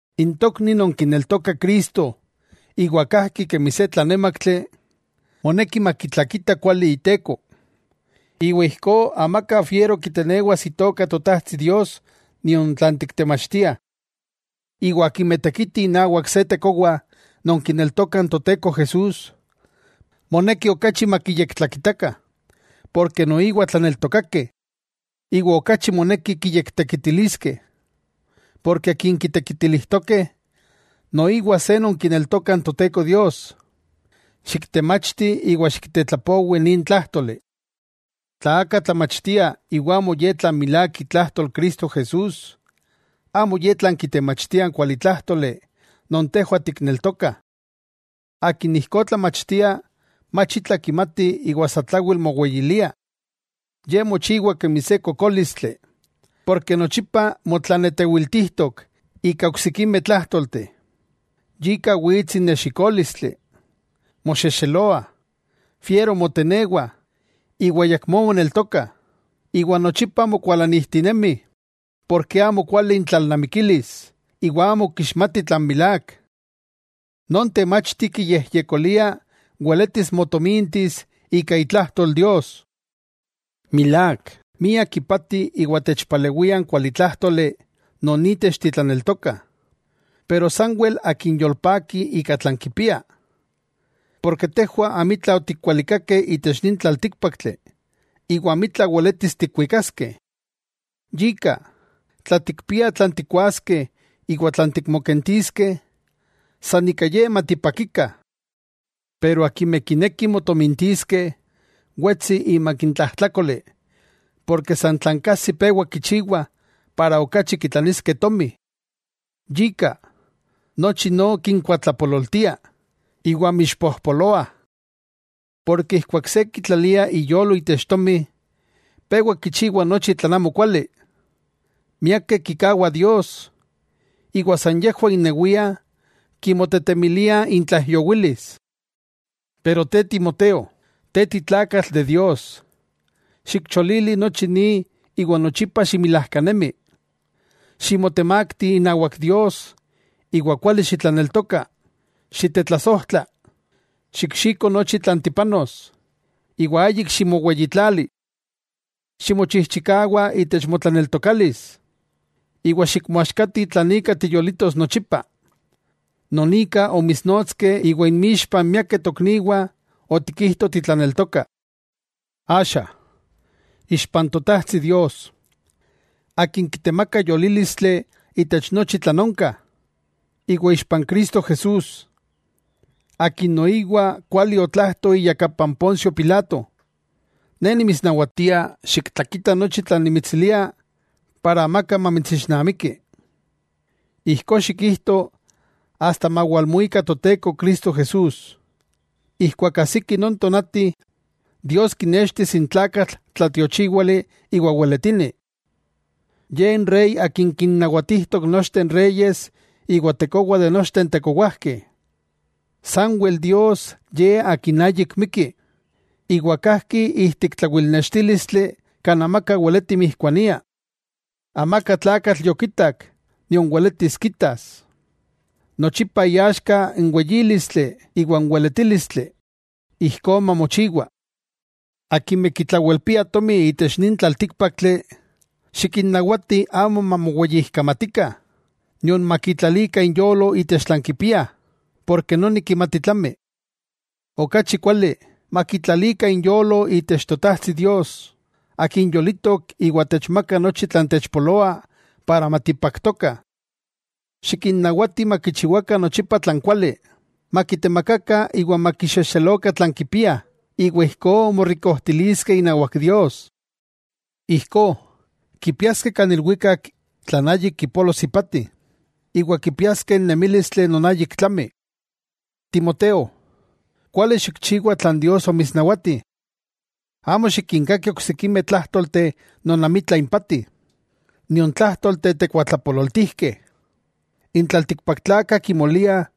N tokni non kineltoka Cristo iwa kajki kemi se tlanémaktli, moneki makitlakita kuali iteko, iwa ijkó amaka fiero kitenewas Itoka Totajtsi Dios nion tlan tiktemachtiah. Iwa akimeh tekitih inawak se tekowa non kineltoka n Toteko Jesús, moneki okachi makiyektlakitakah porke noiwa tlaneltokakeh. Iwa okachi moneki kiyektekitiliskeh, porke akin kitekitilijtokeh, noiwa se non kineltoka n Toteko Dios. Xiktemachti iwa xiktetlapowi de nin tlájtoli. Tla aka tlamachtia iwa amo ye tlan milák itlajtol Cristo Jesús, amo ye tlan kitemachtia n kualitlájtoli non tejwah tikneltokah. Akin ijkó tlamachtia mach itla kimati iwa satlawel moweyilia. Ye mochiwa kemi se kokólistli porke nochipa motlanetewiltijtok ika oksikimeh tlájtolteh, yika wits n nexikólistli, moxexeloah, fiero motenewah iwa ayakmó moneltokah, iwa nochipa mokuakualanijtinemih porke amo kuali intlalnamikilis iwa amo kixmatih tlan milák. Non temachti kiyejyekolia weletis motomintis ika itlajtol Dios. Milák, miak ipati iwa techpalewia n kualitlájtoli non itech titlaneltokah, pero sanwel akin yolpaki ika tlan kipia. Tejwah amitla otikwalikakeh itech nin tlaltíkpaktli iwa amitla weletis tikwikaskeh. Yika, tla tikpiah tlan tikkuaskeh iwa tlan tikmokentiskeh, san ika ye matipakikah. Pero akimeh kinekih motomintiskeh, wetsih imak n tlajtlákoli porke san tlan kajsih pewa kichiwah para okachi kitlaniskeh tomi. Yika nochi no kinkuatlapololtia, iwa mixpojpoloah. Yika keman se kitlalia iyolo itech tomi, pewa kichiwa nochi tlan amokuali. Miakeh kikawah Dios, iwa san yejwah innewiah kimotetemiliah intlaijyowilis. Pero te Timoteo, te titlakatl de Dios, xikcholili nochi ni iwa nochipa ximilajkanemi, ximotemakti inawak Dios iwa kuali xitlaneltoka, xitetlasojtla, xikxiko nochi tlan tipanos, iwa ayik ximoweyitlali. Ximochijchikawa itech motlaneltokalis, iwa xikmoaxkati tlan ika tiyolitos nochipa, non ika omitsnotskeh iwa inmixpa n miakeh tokniwah otikijto titlaneltoka. Axa, ixpa n Totajtsi Dios, akin kitemaka yolílistli itech nochi tlan onka, iwa ixpa n Cristo Jesús, akin noiwa kuali otlajto iyakapa n Poncio Pilato, ne nimitsnawatia xiktlakita nochi tlan nimitsilia para amaka mamitsixnamiki. Ijkó xikchijto asta mawalmuika Toteko Cristo Jesús. Ijkuak ajsiki non tonati, Dios kinextis n Tlakatl tlatiochiwali iwa weletini, Ye n Rey Akin kinnawatijtok nochteh n reyes iwa Tekowa de nochteh n tekowajkeh. Sanwel Dios Ye Akin ayik mikki, iwa kajki ijtik tlawilnextílistli kan amaka weleti mijkuania. Amaka tlakatl yokitak nion weletis kitas. ¡Nochipa iaxka n weyílistli iwa n weletílistli! Ijkó mamochiwa. Akimeh kitlawelpiah tomi itech nin tlaltíkpaktli, xikinnawati amo mamoweyijkamatikah, nion makitlalikah inyolo itech tlan kipiah, porke noni kimati tlami. Okachi kuali, makitlalikah inyolo itech Totajtsi Dios, Akin yolitok iwa techmaka nochi tlan techpoloa para matipaktokah. Xikinnawati makichiwakah nochipa tlan kuali, makitemakakah iwa makixexelokah tlan kipiah, iwa ijkó motomintiskeh inawak Dios. Ijkó, kipiaskeh kan ilwikak tlan ayik kipolos ipati, iwa kipiaskeh n nemílistli non ayik tlami. Timoteo, kuali xikchiwa tlan Dios omitsnawati. Amo xikinkaki oksikimeh tlájtolteh non amitla impati, nion tlájtolteh tekuatlapololtijkeh. N tlaltikpaktlakah kimoliah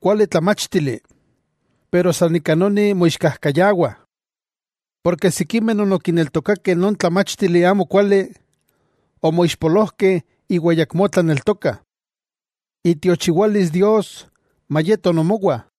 kuali tlamáchtili, san ika noni moixkajkayawah. Porke sikimeh non okineltokakeh non tlamáchtili amo kuali, omoixpolojkeh iwa ayakmó tlaneltokah. Itiochiwalis Dios mayeto nomowah.